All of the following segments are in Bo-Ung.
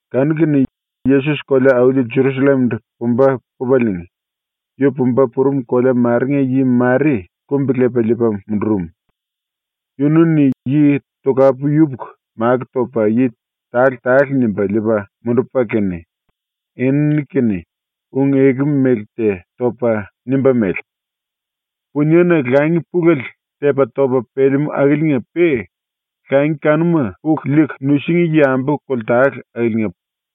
Kanu-kene Yesos ⸤kolea-auli Jerusallem-ndu pumba pupaliinga,⸥ yu pumba purum kolea marenga yi mare kumbi-lepa liipa mundurum. Yunu-ni yi tokapu yupuku makó topa yi tale-tale nimba liipa mundupa kene enini-kene ⸤ung-eku mele te topa⸥ nimba mele: “Puniena langi pulele tepa-topa pelemú akiliinga-pe langi kanuma puku liiku nusingí yambu koltale akiliinga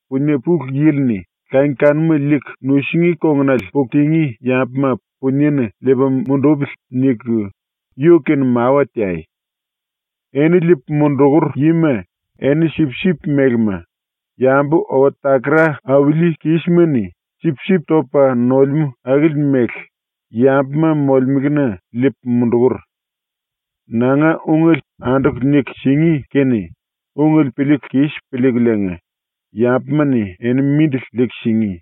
Punie Pulu Yili-ni ‘Langi kanuma liiku nusingí kongunale puku tingí yambuma puniena liipa mundupili.’ niku yu-kene mawa teai. Eni liipu mundukur yima eni sipsip melema, yambu owa-takara auli kísima-ni sipsip topa nolemú akili mele yambuma molemelena liipu mundukur. ⸤Nanga ungele anduku niku singí kene ungele piliiku kis piliikuliinga yambuma-ni eni mindili liiku singí.⸥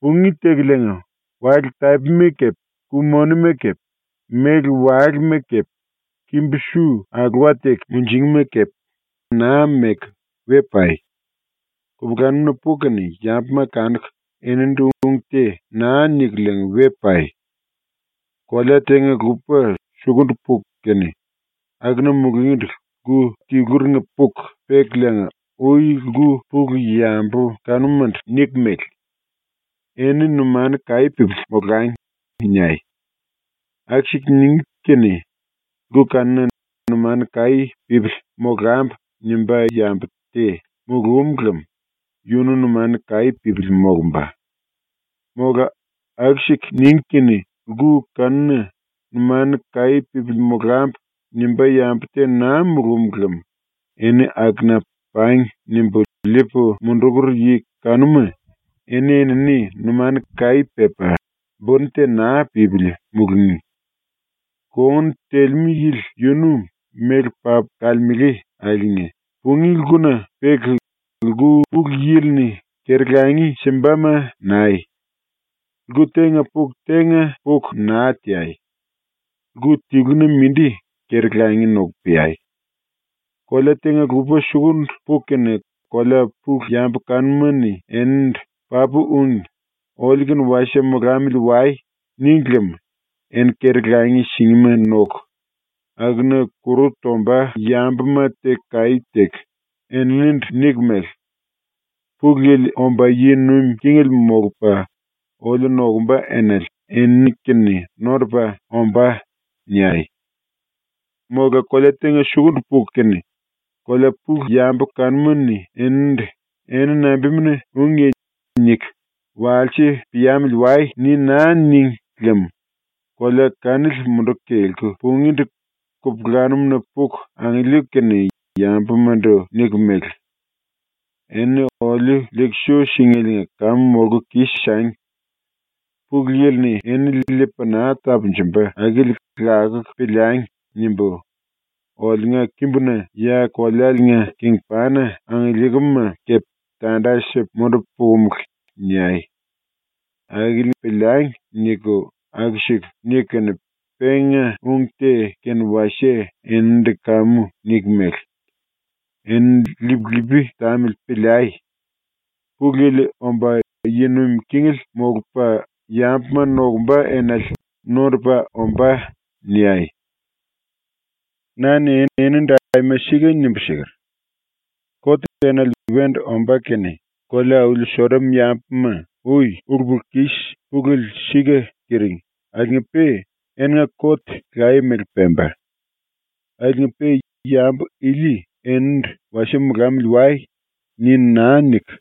Pungí tekuliinga, wale-tapima kepe, ku-moni kepe, méle-walema kepe, kimbu-su ⸤alowa teku munjingí⸥ ma kepe aima naa meku we pai. Kupulanum-na puku kene yambuma kanuku eninindu ung te naa nikuliinga we pai. “Kolea tenga-lupa sukundu puku kene akuna mulungíndu lku tiluringa puku pekuliinga ui lku pulu yambu kanumandu niku mele: “Eni numanu kaí pípili molangi.” niai. Aku-siku ningí kene lku kanuna ‘Numanu kaí pípili molambu.’ nimbá yambu te mulúm lem yunu numanu kaí pípili molumba. Mola aku-siku ningí kene lku kanuna ‘Numanu kaí pípili molambu.’ nimbá yambu te naa mulúm lem eni akuna ‘Pangi.’ nimbu liipu mundukur yi kanuma eni-enini numanu kaí pepa buni te naa pípili mulungí. Kongun telemú yili yunu méle papu kalemele akiliinga pungí lkuna peku, lku pulu yili-ni keri-langi simbama nai. Lku tenga puku tenga puku naa teai. Lku tiluna mindi keri-langi noku peai. “Kolea tenga-lupa sukundu puku kene kolea pulu yambu kanuma-ni enindu “Papu úngi. Oliu-kene wasie molamili wai.” níngi lem eni keri-langi singíma noku, akuna kuru tomba yambuma teku kaí teku, eninindu niku mele: “Pulu Yili omba yi nuim kingele molupa oliu nokumba enale enini-kene nondupa ombá.” niai. “Mola kolea tenga sukundu puku kene kolea pulu yambu kanuma-ni enindu “Eni nambimuna úngiye?” niku, “Wasie piamili wai.” ni naa níngi lem ⸤kolea kanili munduku kelku pungíndu⸥ kupulanum-na puku angiliiku kene yambumandu niku mele: “Enini oliu liiku su síngeliinga kamu molku kis-sangi! ‘Pulu Yili-ni enini liipa naa tapunjumba akili lakuku piliangi!’ nimbu, oliunga kimbuna ya kolealiinga kingpana angiliikim-ma kepe tanda sipu mundupu pukumulu.” niai. ‘Akili piliangi.’ niku aku-siku niku kene penga ung te kene wasie eninindu kamu niku mele: “⸤Enini lip-lipi tamili piliai.⸥ Pulu Yili omba yi nuim kingele molupa yambuma nokumba enale nondupa ombá.” niai. “Na-ni enindu aima sika nimbu siker: “Kot enale wendu ombá kene kolea-auli Sodom ⸤yambuma ui ulu-pulu-kis pulele sika tiring akiliinga-pe⸥ eninga kot laye-mele pemba. Akiliinga-pe yambu ili ⸤enindu “Wasie molamili wai.” ni naa niku,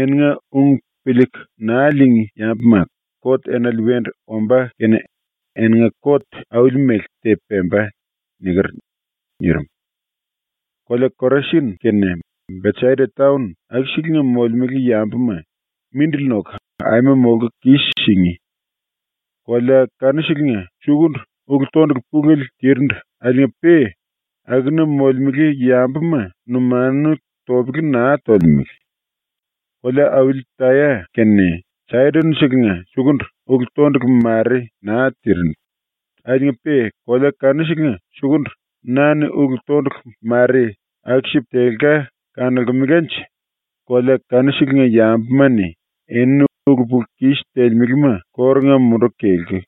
eninga ung piliiku naa liingí yambuma,⸥ kot enale wendu ombá kene eninga kot auli-mele te pemba.” niker.” nirim. “Kolea Korasin kene Besaida taon ⸤akuselenga molemele yambuma⸥ mindili noku aima molku kis-singí. Kolea kanuselenga sukundu ulu-tondulu pulele tirindu ⸤akiliinga-pe akuna molemele yambuma numanu topele naa tolemele⸥. Kolea-auli Taya kene Saidon-selenga sukundu ulu-tondulu mare naa tirindu akiliinga-pe kolea kanuselenga sukundu na-ni ulu-tondulu mare aku-sipu telka kanolkemelanje kolea kanuselenga ⸤yambuma-ni⸥ enini ulu-pulu-kis telemelema kórunga munduku kelku,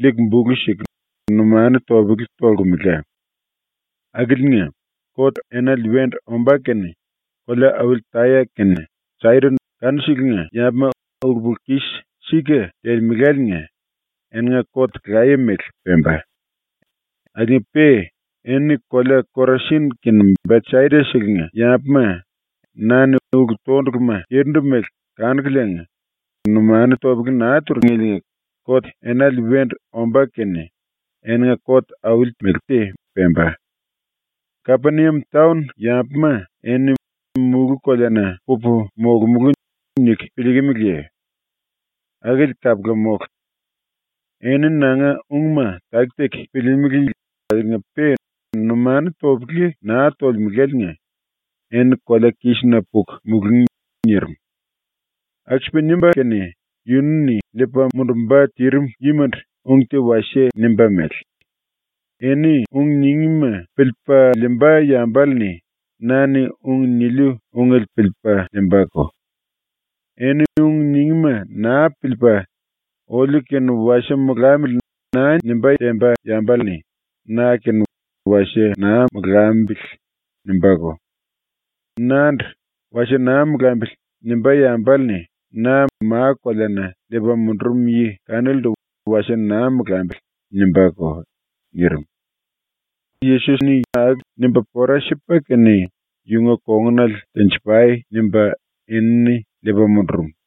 liiku bulu siku, numanu topele tolkemela. ⸤Akiliinga,⸥ kot enale wendu ombá kene kolea-auli Taya kene Saidon kanuselenga ⸤yambuma ulu-pulu-kis sika telemeláliinga⸥ eninga kot laye-mele pemba. Akiliinga-pe eni kolea Korasin kene Besaida-selenga ⸤yambuma na-ni ulu-tonduluma tirindu mele kanukuliinga numanu topele naa turingeliinga⸥ kot enale wendu ombá kene eninga kot auli te mele pemba. “Kapeniam taon ⸤yambuma eni⸥ ‘Mulú-koleana pupu molomulú.’ niku piliikimiliye? Akili kapula mólu. ⸤Eni nanga ungma taki-taki piliilimili akiliinga-pe numanu topele naa tolemeláliinga⸥ eni kolea-kísina puku mulungí.” ⸤nirim.⸥ ⸤Aku-sipa nimba kene yunu-ni liipa mundumba tirim yimandu ung te wasie nimba mele:⸥ “Eni ung ningíma piliipa liimba yambale-ni na-ni ung niliu ungele piliipa liimbako. Eni ung ningíma naa piliipa ‘Oliu kene wasie molamili.’ naa nimbá temba yambale-ni na-kene ‘Wasie naa molambili.’ nimbáko. Nandu ‘Wasie naa molambili.’ nimbá yambale-ni na ma-koleana liipa mundurum yi kanilindu ‘Wasie naa molambili.’ nimbáko.” nirim. ⸤Yesos-ni aku nimba pora sipa kene ‘Yunga kongunale tenji-pai.’ nimba enini liipa mundurum.⸥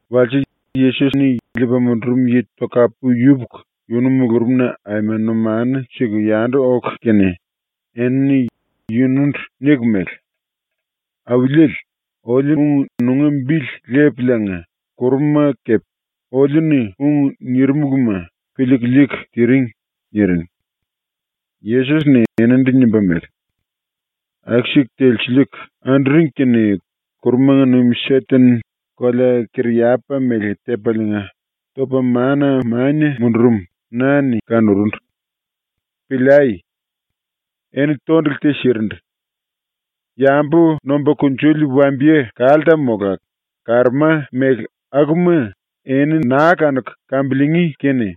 ⸤Walse⸥ Yesos-ni liipa mundurum yi tokapu yupuku yunu mulurumna aima numanu siku yandu oku kene enini yunundu niku mele: “Auliele, oliu-ni nunga bili lepuliinga kuruma kepe oliu-ni ung nirimuluma piliiku liiku tiring.” niring. Yesos-ni eninindu nimba mele: “Aku-siku telsiliiku anduring kene ⸤kurumanga nuim⸥ Seten kolea-kariyapa mele tepaliinga, topa ⸤mana⸥ mania mundurum na-ni kanurundu. Piliai! Eni tondulu te sirindu. Yambu nomba kunjuli wambiye-kalta mola karoma mele akuma eni naa kanuku kambiliingí kene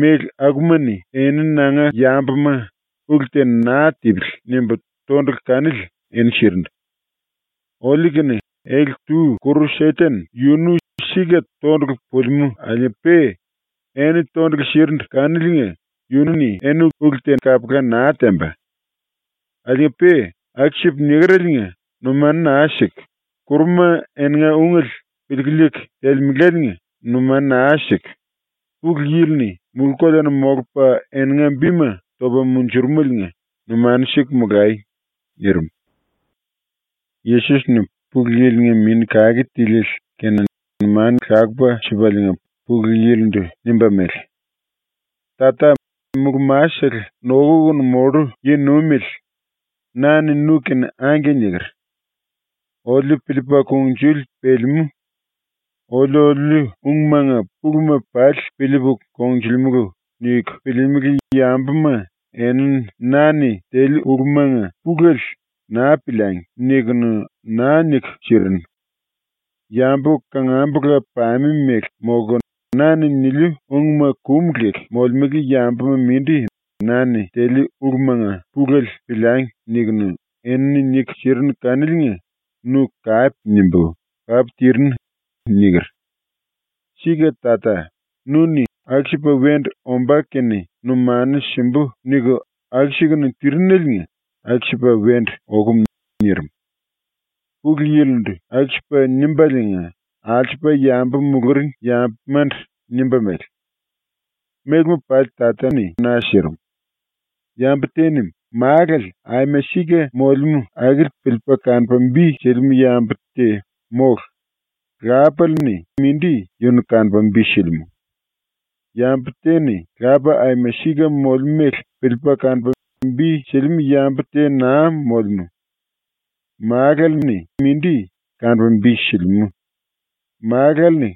méle akuma-ni eni nanga yambuma ‘Ulu te naa tipili.’ nimbu tondulu kanili eni sirindu. Oliu-kene ele-tu ⸤kuru Seten⸥ yunu sika tondulu pulimú akiliinga-pe eni tondulu sirindu kaniliinga yunu-ni eni ulu te kapula naa temba. Akiliinga-pe aku-sipu nikereliinga numanu naa siku, kuruma eninga ungele piliiku liiku telemeláliinga numanu naa siku; ⸤Pulu Yili-ni⸥ mulú-koleana ⸤molupa⸥ eninga bima topa munjurumeliinga numanu siku molai.” nirim. Yesos-ni Pulu Yili-nga Mini Kake Tiliele kene numanu lakupa sipaliinga Pulu Yili-ndu nimba mele: “Tata, Mulú-Masele Nokukunu Mollu Yi-Nuimele, na-ni nu-kene “Angke” niker. ‘Oliu piliipa kungnjuli pelemú. Oliu oliuliu ungmanga puluma pali piliipu kongnjulimulu.’ niku piliilimili yambuma enini na-ni teliu ulumanga pulele ‘Naa piliangi.’ nikunu naa niku sirinu. Yambu kangambula-pame ⸤mele⸥ molku, na-ni niliu ungma kum leku molemele yambuma mindi na-ni teliu ulumanga pulele ‘Piliangi.’ nikunu, enini niku sirinu kaniliinga nu kape nimbu “Papu tirinu.” niker. Sika Tata, nu-ni ‘aku-sipa wendu ombá kene numanu simbu.’ niku aku-sikunu tirineliinga ⸤aku-sipa wendu okum.⸥” nirim. ⸤Pulu Yili-ndu aku-sipa nimbaliinga alsupa yambu muluring yambumandu nimba mele:⸥ “Mélema pali Tata-ni na sirim. Yambu te-ni Málale aima sika molemú akili piliipa kanupa bi silimú yambu te mólu; lápale-ni mindi yunu kanupa bi silimú. Yambu te-ni Lapa aima sika molemú mele piliipa kanupa bi silimú yambu te naa molemú. Málale-ni mindi kanupa bi silimú; Málale-ni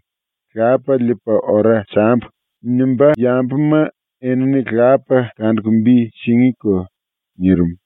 ‘Lapa liipu ora sambu.’ nimbá yambuma enini Lapa kanuku bi singíko.” nirim.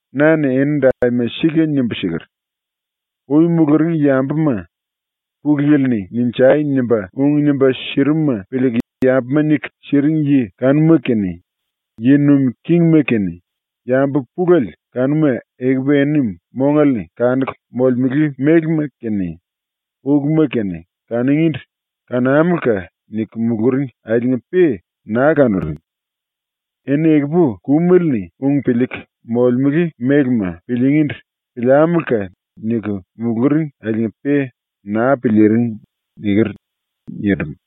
Na-ni enindu aima sika nimbu siker: “Ui muluring yambuma, Pulu Yili-ni “Ninjai!” nimba ung nimba sirimuma piliiku yambuma niku siring yi kanuma kene, yi nuim kingima kene, yambu pulele kanuma ekupu eni mongale-ni kanuku molemele mélema kene uluma kene kanungíndu “Kanámuluka!” niku muluring akiliinga-pe naa kanuring. Eni ekupu kumele-ni ung piliiku molemele mélema piliingíndu “Piliámuluka!” niku muluring akiliinga-pe naa piliiring.” niker.” nirim.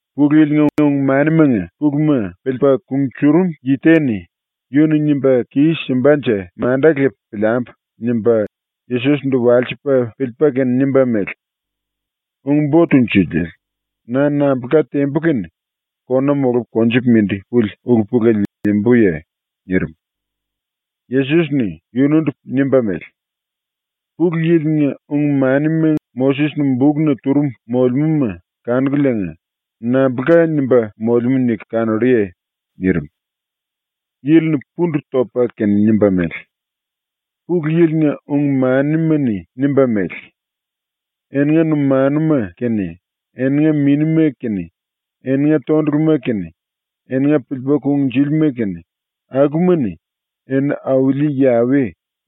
Pulu Yili-nga ung-manimanga puluma piliipa kunjurum yi te-ni ‘Yu-ni nimba kis-simbanje manda lepu piliambu.’ nimba Yesos-ndu walsipa piliipa kene nimba mele: “Ung-Bo Tunjuliele, na nambulka tembu kene kona molupu konjupu mindi puli ulu-pulele liimbuye?” nirim. Yesos-ni yunundu nimba mele: “Pulu Yili-nga ung-manima Moses-ni bukna turum molemúma kanukuliinga nambulka nimba molemú niku kanolluye?” nirim. Yili-ni pundu topa kene nimba mele: “Pulu Yili-nga ung-manima-ni nimba mele: ‘Eninga numanuma kene, eninga minima kene, eninga tonduluma kene, eninga piliipa kungnjúlima kene, akuma-ni eni Auli Yawe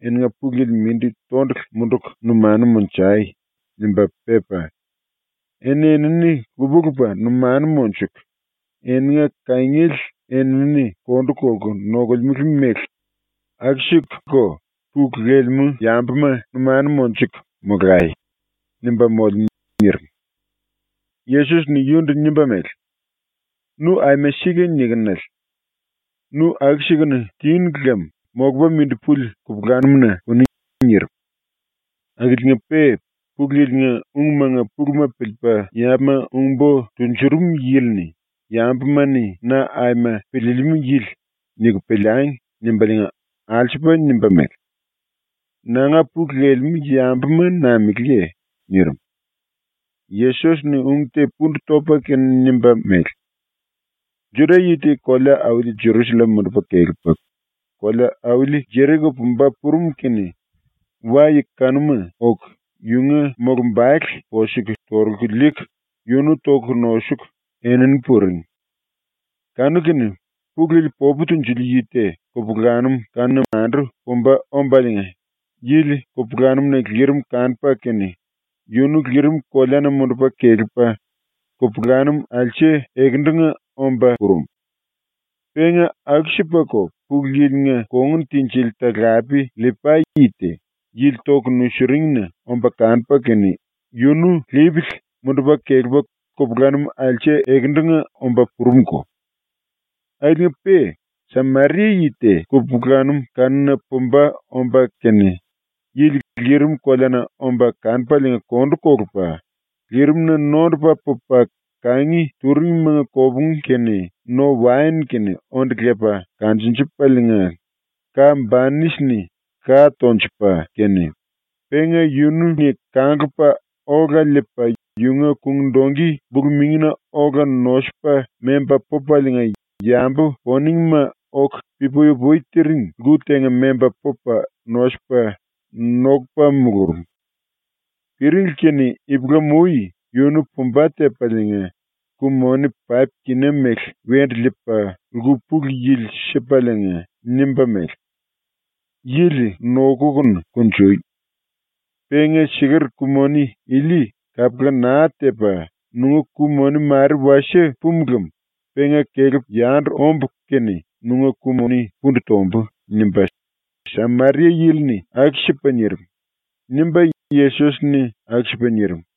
eninga Pulu Yili mindi tondulu munduku numanu monjai.’ nimba pepa, ‘Eni-enini lupa-lupa numanu monjuku eninga kangiele eni-enini kondu kolku nokolemele mele aku-sikuko pulu lelemú yambuma numanu monjuku nokuku molai.’ nimba molemú.” nirim. Yesos-ni yunundu nimba mele: “Nu aima sika nikinele. Nu aku-sikunu tinu lem molupa mindi puli kupulanum-na puni.” nirim. Akiliinga-pe Pulu Yili-nga ungmanga puluma piliipa yambuma ung-bo tunjuring yili-ni ‘Yambuma-ni ‘Na aima piliilimú yili’ niku piliangi.’ nimbaliinga alsupa nimba mele: “Nanga pulu lelemú yambuma nameléye?” nirim. Yesos-ni ung te pundu topa kene nimba mele: “Juda-yi te kolea-auli Jerusallem mundupa kelepa kolea-auli Jeriko pumba purum kene wa-yi kanuma oku yunga mulumbale posuku torulku liiku yunu toku nosuku enini puring. Kanu-kene Pulu Yili popu tunjuli yi te kupulanum kanuna mandu pumba ombaliinga yili kupulanum-na lirimele kanupa kene yunu lirim koleana mundupa kelepa kupulanum alse ekendunga omba purum. Penga aku-sipako Pulu Yili-nga kongun tinjili talape LLipai yi te yili toku nusiringina omba kanupa kene yunu lipili mundupa kelepa kupulanum alse ekendunga omba purumko. Akiliinga-pe Sameria yi te kupulanum kanuna pumba omba kene yili lirim koleana omba kanupaliinga kondu kolupa, lirimna nondupa pupa kangi turingmanga kopungu kene no-waen kene onde lepa kanjunjupaliinga ka-banisi-ni ka tonjupa kene, penga yunu-ni kanglupa ola liipa yunga kung-dongki bulu-mingina ola nosupa memba pupaliinga yambu poningma oku pi-pui-upui tiring lku tenga memba pupa nosupa nokupa mulurum. Piringli kene ipulam-ui yunu pumba tepaliinga ku-moni paip-kina mele wendu liipa lku pulu yili sipaliinga nimba mele: “Yili nokukunu kunjui. Penga siker ku-moni ili kapula naa tepa nunga ku-moni mare wasie pumu lem penga kelepu yandu ombu kene nunga ku-moni pundu tombu.” nimba Sameria-yili-ni aku-sipa nirim.” ⸤nimba Yesos-ni aku-sipa nirim.⸥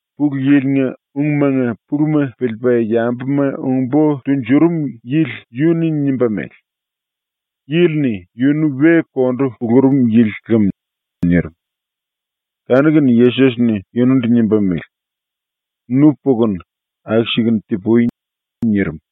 Pulu Yili-nga ungmanga puluma piliipa yambuma ung-bo tunjuring yili yunu-ni nimba mele: “Yili-ni yunu we kondu kulurum yili lem.” nirim. Kanu-kene Yesos-ni yunundu nimba mele: “Nu pukunu aku-sikunu ti-pui.” nirim.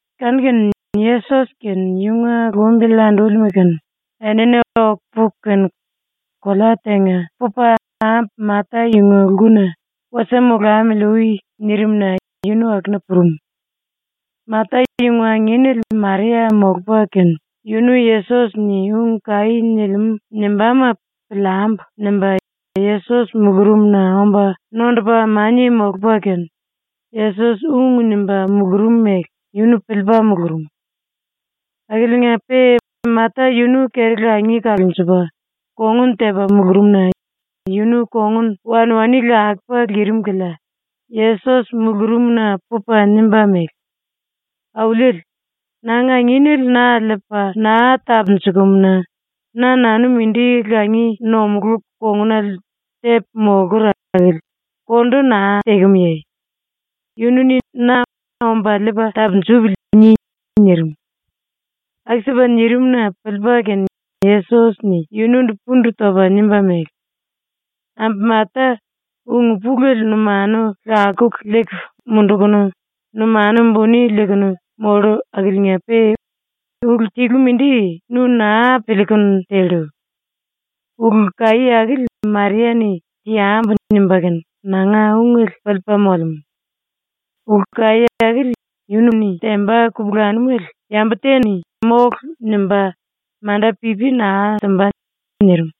Kanu-kene Yesos kene yunga lumbili andúlima kene enini oku puku kene kolea tenga pupa ambu Mata yunga lkuna “Wasie molamili ui.” nirim-na yunu akuna purum. Mata yunga anginele Maria molupa kene yunu Yesos-ni ung kaí nilimú nimbáma ‘Piliambu.’ nimba Yesos mulurumna omba nondupa mania molupa kene Yesos ung nimba mulurum mele yunu piliipa mulurum. Akiliinga-pe Mata yunu keri-langi kalunjupa, kongun tepa mulurum-na yunu kongun wanwani lakupa lirim kilia Yesos mulurumna pupa nimba mele: “Auliele, nanga anginele na liipa naa tapunjukumu-na na-nanu mindi langi nomulú kongunale tepu molkur akili kondu naa tekemuye? Yunu-ni na ‘Omba liipa tapunjupili.’ ni.” nirim. Aku-sipa nirim-na piliipa kene Yesos-ni yunundu pundu topa nimba mele: “Ambu Mata, ulu pulele numanu lakuku liiku mundukunu numanu buni liikunu mollu akiliinga-pe ulu tilu mindi nu naa piliikunu tellu. Ulu kaí akili Maria-ni ‘Teambu.’ nimba kene ⸤nanga ungele piliipa⸥ molemú. Ulu kaí akili yunu-ni temba kupulanumele yambu te-ni “Mólu!” nimba manda pipi naa simba.” nirim.